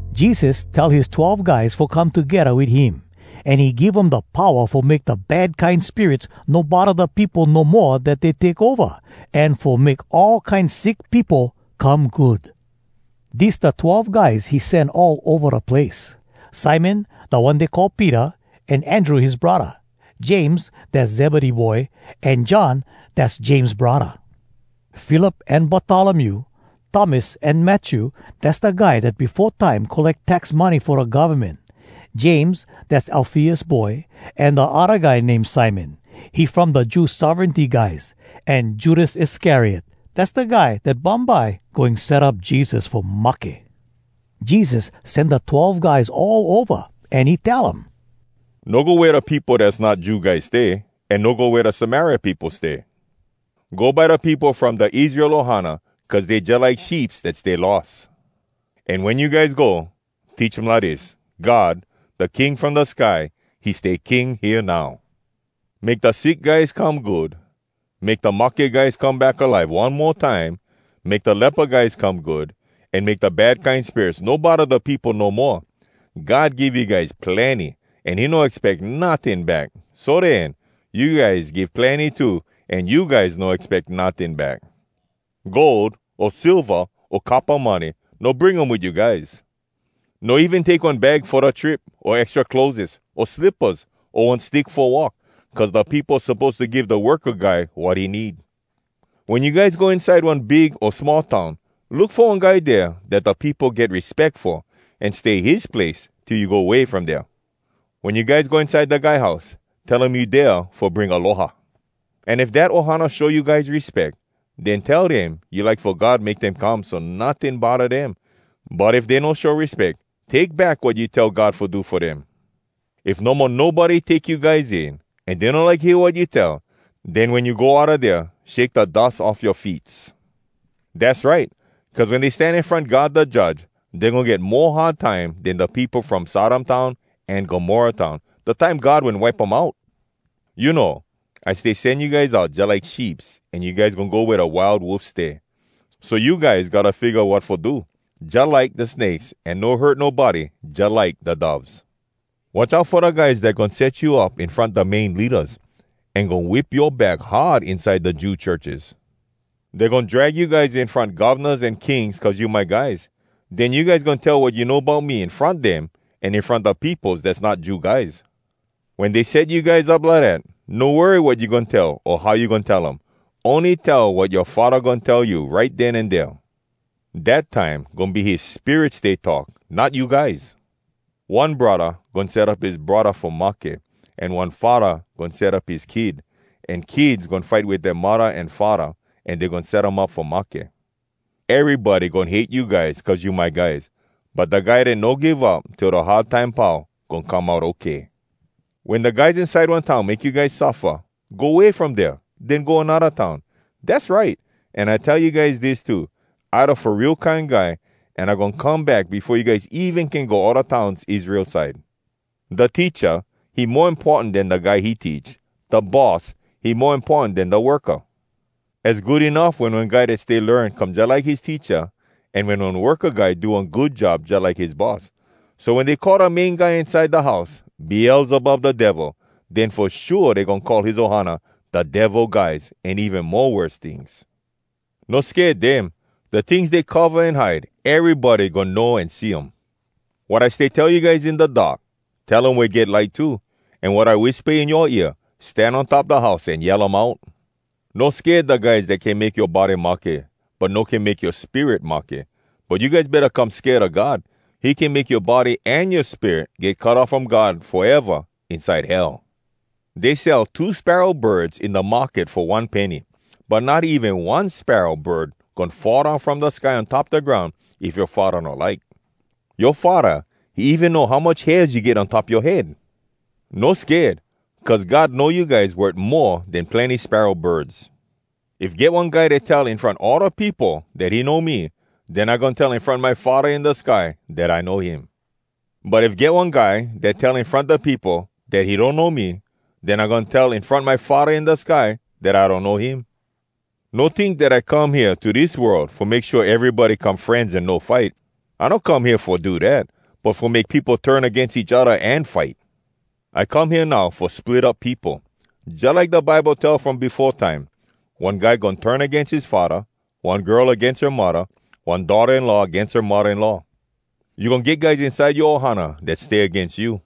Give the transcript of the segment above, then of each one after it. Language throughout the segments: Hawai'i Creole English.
Jesus tell his twelve guys fo come togedda wit him, an he give um da powa fo make da bad kine spirits no bodda da peopo no moa dat dey take ova, an fo make all kine sick peopo come good. Dis da twelve guys he sen all ova da place: Simon, da one dey call Peter, an Andrew his braddah; James, dass Zebedee boy, an John, dass James braddah; Philip an Bartolomew; Thomas an Matthew, dass da guy dat befo time colleck tax money fo da govmen; James, dass Alfeus boy, an da odda guy name Simon, he from da Jew sovereignty guys; an Judas Iscariot, dass da guy dat bumbye goin set up Jesus fo mahke. Jesus sen da twelve guys all ova, an he tell um, “No go wea da peopo dass not Jew guys stay, an no go wea da Samaria peopo stay. Go by da peopo from da Israel ohana, cuz dey jalike sheeps dat stay lost. An wen you guys go, teach um lidis, ‘God, da King from da sky, he stay King hea now.’ Make da sick guys come good, make da mahke guys come back alive one mo time, make da lepa guys come good, an make da bad kine spirits no bodda da peopo no moa. God give you guys plenny, an he no expeck notting back. So den, you guys give plenny too, an you guys no expeck notting back. Gold, o silva, o coppa money, no bring um wit you guys. No even take one bag fo da trip, o extra clotheses, o slippas, o one stick fo walk; cuz da peopo suppose to give da worka guy wat he need. “Wen you guys go inside one big o small town, look fo one guy dea dat da peopo get respeck fo, an stay his place till you go way from dea. Wen you guys go inside da guy house, tell um you dea fo bring aloha. An if dat ohana show you guys respeck, den tell dem you like fo God make dem come so notting bodda dem. But if dey no show respeck, take back wat you tell God fo do fo dem. If no mo nobody take you guys in, an dey no like hear wat you tell, den wen you go outa dea, shake da dus off yoa feets. Dass right! Cuz wen dey stan in front God da Judge, dey goin get mo hard time den da peopo from Sodom town an Gomorrah town, da time God wen wipe um out. “You know, I stay send you guys out jalike sheeps, an you guys goin go wea da wild wolfs stay. So you guys gotta figga wat fo do, jalike da snakes, an no hurt nobody, jalike da doves. Watch out fo da guys dat goin set you up in front da main leadas, an goin whip yoa back hard inside da Jew churches. Dey goin drag you guys in front govnas an kings cuz you my guys. Den you guys goin tell wat you know bout me in front dem, an in front da peopos dass not Jew guys. Wen dey set you guys up lidat, no worry wat you goin tell o how you goin tell um. Ony tell wat yoa Faddah goin tell you right den an dea. Dat time goin be his Spirit stay talk, not you guys. “One braddah goin set up his braddah fo mahke, an one faddah goin set up his kid, an kids goin fight wit dea muddah an faddah, an dey goin set um up fo mahke. Erybody goin hate you guys cuz you my guys. But da guy dat no give up till da hard time pau goin come out okay. “Wen da guys inside one town make you guys suffa, go way from dea, den go anodda town. Dass right! An I tell you guys dis too: I da Fo Real Kine Guy, an I goin come back befo you guys even can go all da towns Israel side. “Da teacha, he mo importan den da guy he teach. Da boss, he mo importan den da worka. Az good enuff wen one guy dat stay learn come jalike his teacha, an wen one worka guy do one good job jalike his boss. So wen dey call da main guy inside da house ‘Beelzebub Da Devil,’ den fo shua dey goin call his ohana ‘Da Devil Guys’ an even mo worse tings. “No sked dem. Da tings dey cova an hide, erybody goin know an see um. Wat I stay tell you guys in da dark, tell um wea get light too. An wat I wispa in yoa ear, stan on top da house an yell um out. No sked da guys dat can make yoa body mahke, but no can make yoa spirit mahke. But you guys betta come sked a God. He can make yoa body an yoa spirit get cut off from God foeva inside Hell. Dey sell two sparrow birds in da market fo one penny. But not even one sparrow bird goin fall down from da sky on top da groun if yoa Faddah no like. Yoa Faddah, he even know how much hairs you get on top yoa head! No sked! Cuz God know you guys worth mo den plenny sparrow birds. “If get one guy dat tell in front all da peopo dat he know me, den I goin tell in front my Faddah in da sky dat I know him. But if get one guy dat tell in front da peopo dat he donno me, den I goin tell in front my Faddah in da sky dat I donno him. “No tink dat I come hea to dis world fo make shua erybody come frenz an no fight. I no come hea fo do dat, but fo make peopo turn agains each odda an fight! I come hea now fo split up peopo. Jalike da Bible tell from befo time, ‘One guy goin turn agains his faddah, one girl agains her muddah, one daughtah-in-law agains her muddah-in-law. You goin get guys inside yoa ohana dat stay agains you.’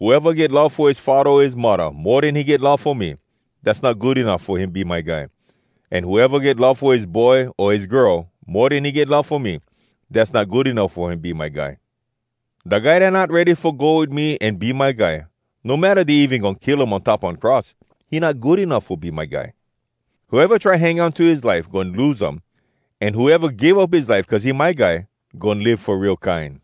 “Whoeva get love fo his faddah o his muddah mo den he get love fo me, dass not good enuff fo him be my guy. An whoeva get love fo his boy o his girl mo den he get love fo me, dass not good enuff fo him be my guy. Da guy dat not ready fo go wit me an be my guy, no matta dey even goin kill um on top one cross, he not good enuff fo be my guy. Whoeva try hang on to his life goin lose um. An whoeva give up his life cuz he my guy, goin live fo real kine.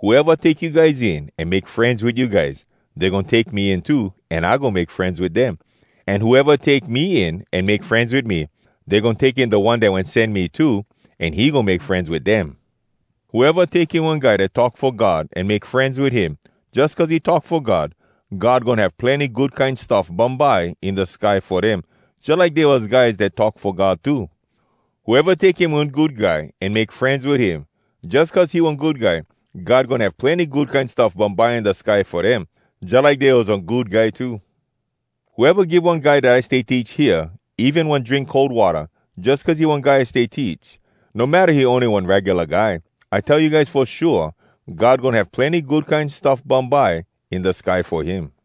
“Whoeva take you guys in an make frenz wit you guys, dey goin take me in too, an I goin make frenz wit dem. An whoeva take me in an make frenz wit me, dey goin take in da One dat wen sen me too, an he goin make frenz wit dem. Whoeva take in one guy dat talk fo God an make frenz wit him, jus cuz he talk fo God, God goin have plenny good kine stuff bumbye in da sky fo dem, jalike dey was guys dat talk fo God too. Whoeva take in one good guy an make frenz wit him, jus cuz he one good guy, God goin have plenny good kine stuff bumbye in da sky fo dem, jalike dey was one good guy too. Whoeva give one guy dat I stay teach hea even one drink cold watta, jus cuz he one guy I stay teach, no matta he ony one regula guy, I tell you guys fo shua, God goin have plenny good kine stuff bumbye in da sky fo him.”